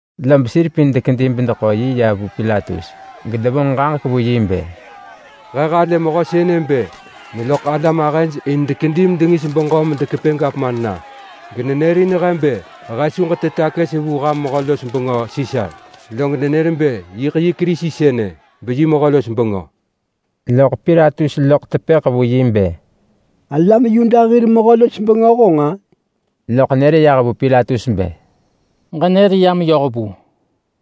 Lob sir pin dekedi bedeḳo yi ya vu Pilatus gedevonġ ġaġek vu yi bë, “He halë mehö sënë bë neloḳ alam ahëj in dekedi medengis beġö medekepë gavman na. Genenërin he bë he su ġetë takës vu ham mehö-los-bengö Sisar. Log nenër bë yiḳ yi Kerisi sënë, beyi mehö-los-bengö.” Loḳ Pilatus loḳ tepëḳ vu yi bë, “Alam Yuda hir mehö-los-bengö honġ-a?” Loḳ nër yah vu Pilatus bë, “Ġenër ya meyoh vu.”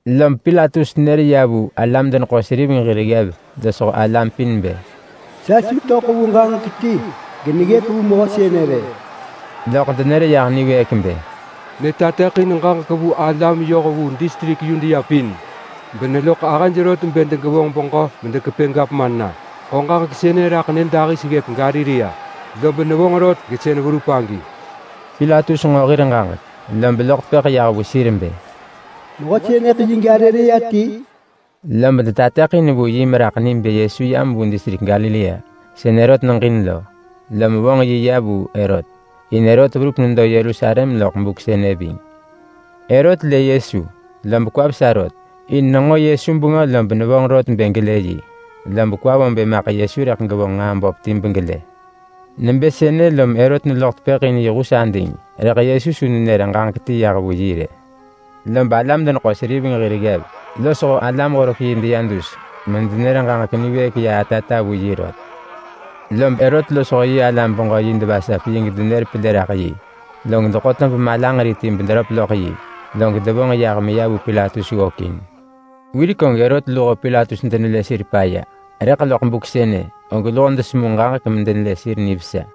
Lob Pilatus nër ya vu alam-deneḳo-seriveng hir ggev losho alam pin bë, “Sa su töḳ vu ġaġek ti geneggëp vu mehö sënë rë.” Loḳ denër yah niwëëk bë, “Netateḳin ġaġek vu alam yoh vu distrik Yudea pin beneloḳ ahëj rot bë degevonġ beġö medekepë gavman na. Ḳo ġaġek sënë raḳ nyëdahis ggëp Galilea, lob nevonġ rot, gesën verup agi.” Pilatus nġo hir ġaġek, lob loḳ tepëḳ yah vu sir bë, “Mehö sënëḳ yi Galilea ti?” Lob detateḳin vu yi meraḳ ni bë Yesu yam vu distrik Galilea sën Herot neġin lo, lom vonġ yi ya vu Herot. In Herot verup nedo Yerusalem loḳ buk sënë ving. Herot lë Yesu, lob kwa vesa rot, in nenġo Yesu bengö lob nevonġ rot bë gelë yi. Lob kwa vo bë maḳ Yesu rëḳ gevonġ nġaa böp ti begelë. Nebë sënë lom Herot neloḳ tepëḳ in yi hus ading. Rëḳ Yesu su nenër ġaġek ti yah vu yi rë. Lob alam-deneḳo-seriveng hir ggev losho alam-horek-yi deya dus medenër ġaġek niwëëk ya atata vu yi rot. Lob Herot losho yi alam-beġö-yi devasap yi gedenër pelë raḳ yi. Log deḳo tob malanġeri ti bederöp loḳ yi, log devonġ yah meya vu Pilatus ggökin. Wirek og Herot luho Pilatus denelë sir paya, rëḳ loḳ buk sënë, og luho desemu ġaġek medenelë sir nivesa.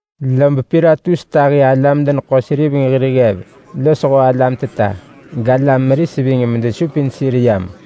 Lob Pilatus tahi alam-deneḳo-seriveng hir ggev losho alam teta, galam meris ving medesupin sir yam.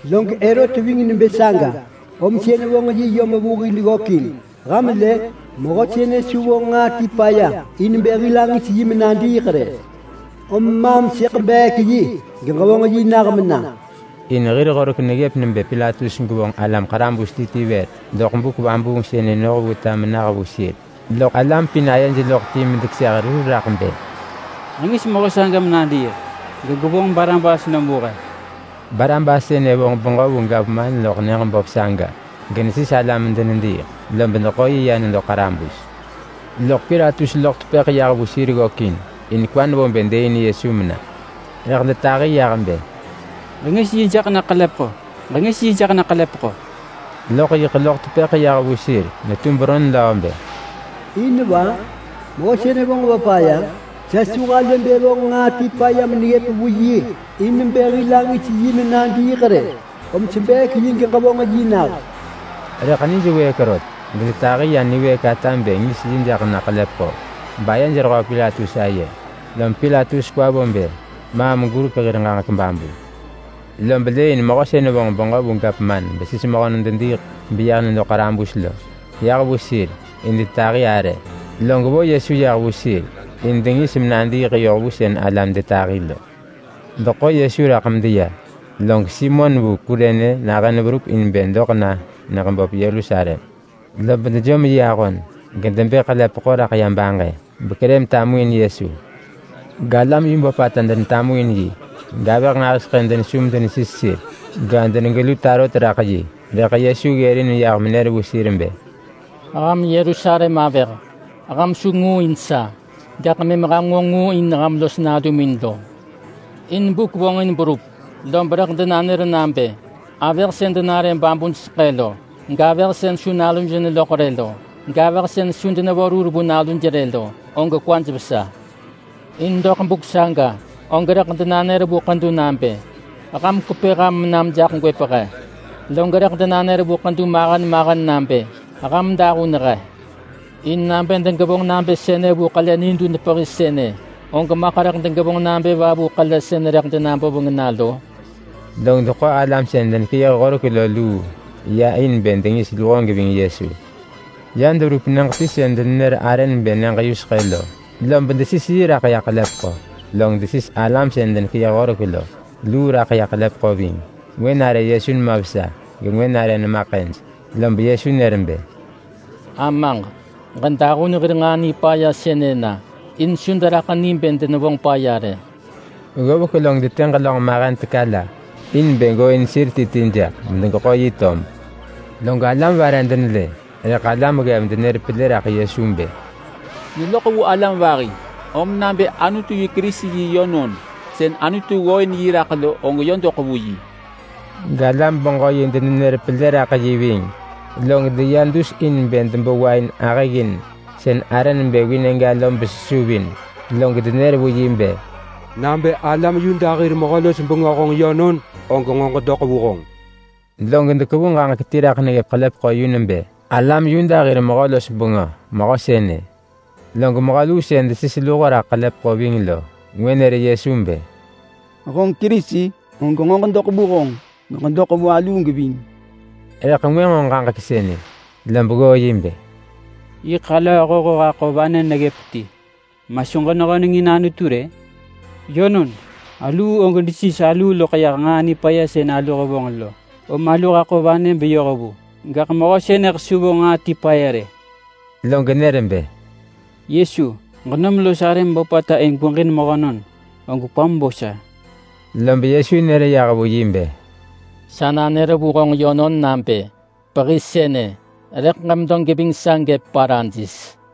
Log Herot ving nebë saga om sën vonġ yi yom vu hil ggökin. Ham lë! Mehö sënë su vonġ nġaa ti paya in bë hil angis yi menadiiḳ rë. Om maam sëḳ beek yi geġevonġ yi nah mena.” [In hir horek neggëp nebë Pilatus gevonġ alam ḳarabus ti ti vër doḳ buk vabuung sënë noh vu ta menah vu sir.] Loḳ alam pin ayej loḳ ti medekeseh rur raḳ bë, “Ġengis mehö saga menadiiḳ gegwevonġ Barabas nom vu he.” Barabas sënë vonġ beġö vu gavman loḳ nyëġ böp saga genesis alam medenediiḳ, lob deḳo yi ya nedo ḳarabus. Loḳ Pilatus loḳ tepëḳ yah vu sir ggökin, in kwa nevo bë dëëin Yesu mena. Rëḳ detahi yah bë, “Ġengis yi jaḳ na ḳelepeḳo! Ġengis yi jaḳ na ḳelepeḳo!” Loḳ yiḳ loḳ tepëḳ yah vu sir netu beron löö bë, “In va? Mehö sënë vonġ va paya? Sa su halë bë vonġ nġaa ti paya meneggëp vu yi in bë hil angis yi menadiiḳ rë. Om sebeek yi geġevonġ yi nah.” Rëḳ nij wëëk rot, gedetahi ya niwëëk ata bë ngis yi jaḳ na ḳelepeḳo, bayej rehöö Pilatus aye. Lob Pilatus kwa vo bë maam gurek hir ġaġek babu. Lob lëëin mehö sën vonġ beġö vu gavman besis mehönon dediiḳ beya nedo ḳarabus lo yah vu sir in detahi arë. Log vo Yesu yah vu sir in bë dengis menadiiḳ yoh vu sën alam detahi lo. Deḳo Yesu raḳ medeya, log Simon vu Kurene nahën verup neya in bë doḳ na nyëġ böp Yerusalem. Lob dejom yi ahon gedebë ḳelepeḳo raḳ ya baġë bekerë metamuin Yesu. Galam yu böpata denetamuin yi, gavëh nġahiseḳë denesu medenesis sir, gedenegelu tarot raḳ yi. Rëḳ Yesu ggërin yah menër vu sir bë, “Ham Yerusalem avëh, ham su ngu in sa, gaḳ mëm ham nġo ngu in ham los nalumin lo. In buk vonġin berup lob rëḳ denanër nabë: ‘Avëh sën denare babuj seḳë lo, gavëh sën su naluj neloḳ rë lo, gavëh sën su denevo rur vu naluj rë lo, og kwaj vesa.’ In doḳ buk saga, og ‘rëḳ denanër vu ḳedu nabë, “Ham kwepë ham menam jaḳ gwëp he!” Log rëḳ denanër vu ḳedu mahen mahen nabë, “Ham dahun he!” ’ In nabë degevonġ nabë sënë vu ḳele nidun pehi sënë, og maḳ rëḳ degevonġ nabë va vu ḳele sën rëḳ denaboveng na lo?” Log deḳo alam sën denekeyëh horek lo luu ya in bë dengis luho geving Yesu. Ya deverup nyëġ ti sën denenër arë nebë Nyëġ-yuseḳë lo lob desis yi raḳ ya ḳelepeḳo. Log desis alam sën denekeyëh horek lo luu raḳ ḳelepeḳo ving. Ngwë nare Yesu nema vesa, gengwë nare nema ḳëj. Lob Yesu nër bë, “Amaġ, ġedahun sir sën devasap sa lo hir nġaa nipaya sënë na. In su deraḳ ni bë denevonġ paya rë.” Ggovek log detë ġelönġ mahen teka la in bë gooin sir ti ti jaḳ medegeḳo yi tob. Log alam vare denelë. Rëḳ alam ggev denër pelë raḳ yi bë, “Neloḳ vu alam vahi. Om nabë Anutu yi Kerisi yi yönon sën Anutu ggooin yi raḳ lo, og yö doḳ vu yi.” Galam-beġö-yi denenër pelë raḳ yi ving. Log deya dus in bë debo wain ahëggin sën arë nebë vinegga lo besesuvin. Log denër vu yi bë, “Nabë alam Yuda hir mehö-los-bengö honġ yönon, og nġo ġedoḳ vu honġ.” Log dekevu ġaġek ti raḳ neggëp ḳelepeḳo yu nebë: ALAM YUDA HIR MEHÖ-LOS-BENGÖ MEHÖ SËNË. Log mehö luu sën desis luho raḳ ḳelepeḳo ving lo ngwë nër Yesu bë, “Honġ Kerisi? Og nġo ġedoḳ vu honġ, geġedoḳ vu aluu geving!” Rëḳ ngwë nġo ġaġek sënë, lob ggoo yi bë, “Yiḳ alöö hoho haḳo vanë neggëp ti, ma su genehöneng in Anutu rë? Yönon, aluu og desis aluu loḳ yah nġaa nipaya sën alu hevonġ lo, om alu haḳo vanë beyoh vu. Gaḳ mehö sënëḳ su vonġ nġaa ti paya rë.” Log nër bë, “Yesu, ġenom los arëm böpata in gweġin mehönon, og kwam bo sa.” Lob Yesu nër yah vu yi bë, “Sa nanër vu honġ yönon nabë: Pehi sënë, rëḳ ġemedo geving sa gëp Paradis.”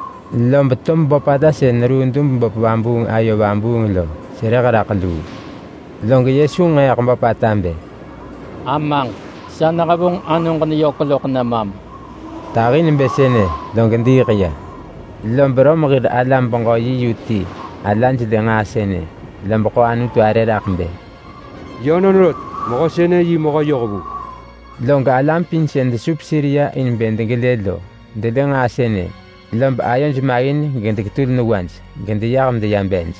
Lob tob böpata sën neruu dub-vabuung-böp ayo vabuung lo kweeḳ raḳ luu. Log Yesu nġeeḳ böpata bë, “Amaġ, sa nehevonġ anoġ neyök loḳ nemam.” Tahi nebë sënë, log diiḳ ya. Lob Rom hir alam-beġö-yi yu ti hir ala lë nġaa sënë, lob ḳo Anutu arë raḳ bë, “Yönon rot, mehö sënë yi mehö yohvu!” Log alam pin sën desup sir ya in bë degelë lo delë nġaa sënë, lob ayoj maggin gedesis sir gedeyah medeya bej.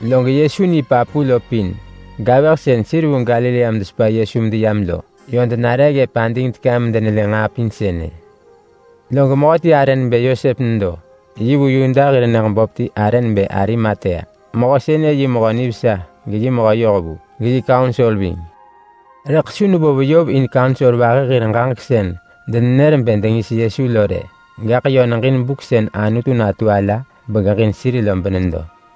Log Yesu ni papu lo pin, gavëh sën sir vu Galilea medesepa Yesu medeyam lo yö denare ggëp ading teka medenelë nġaa pin sënë. Log mehöti arë nebë Yosep nedo. Yi vu Yuda hir nyëġ böp ti arë nebë Arimatea. Mehö sënë yi mehö nivesa geyi mehö yohvu, geyi kaunsor ving. Rëḳ su nevo veyov in kaunsor vahi hir ġaġek sën denenër bë dengis Yesu lo rë. Gaḳ yö neġin buk sën Anutu natu ala begeġin sir lo benedo.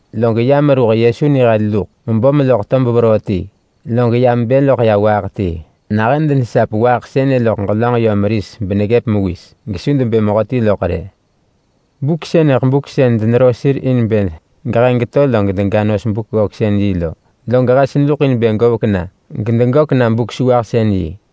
Log ya meruh Yesu nihel navi luḳ mebom loḳ tob veroo ti, log ya mebë loḳ waaḳ ti. Nahën denesap waaḳ sënë loḳ ġelönġ yö meris beneggëp mewis, gesu debë mehö ti loḳ rë. Buk sënëḳ buk sën denero sir in bë geheng geto log dega nos Buk-ggöksën-yi lo, log hes neluḳ in bë govek na gedegök na Buk-sewahsën-yi.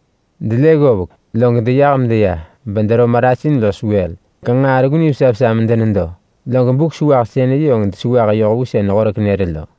Delë ggovek, log deyah medeya bedero marasin los wël, genġaa sën reggu nivesa vesa lo medenedo. Log Buk-sewahsën-yi og desewah yoh vu sën horek nër lo.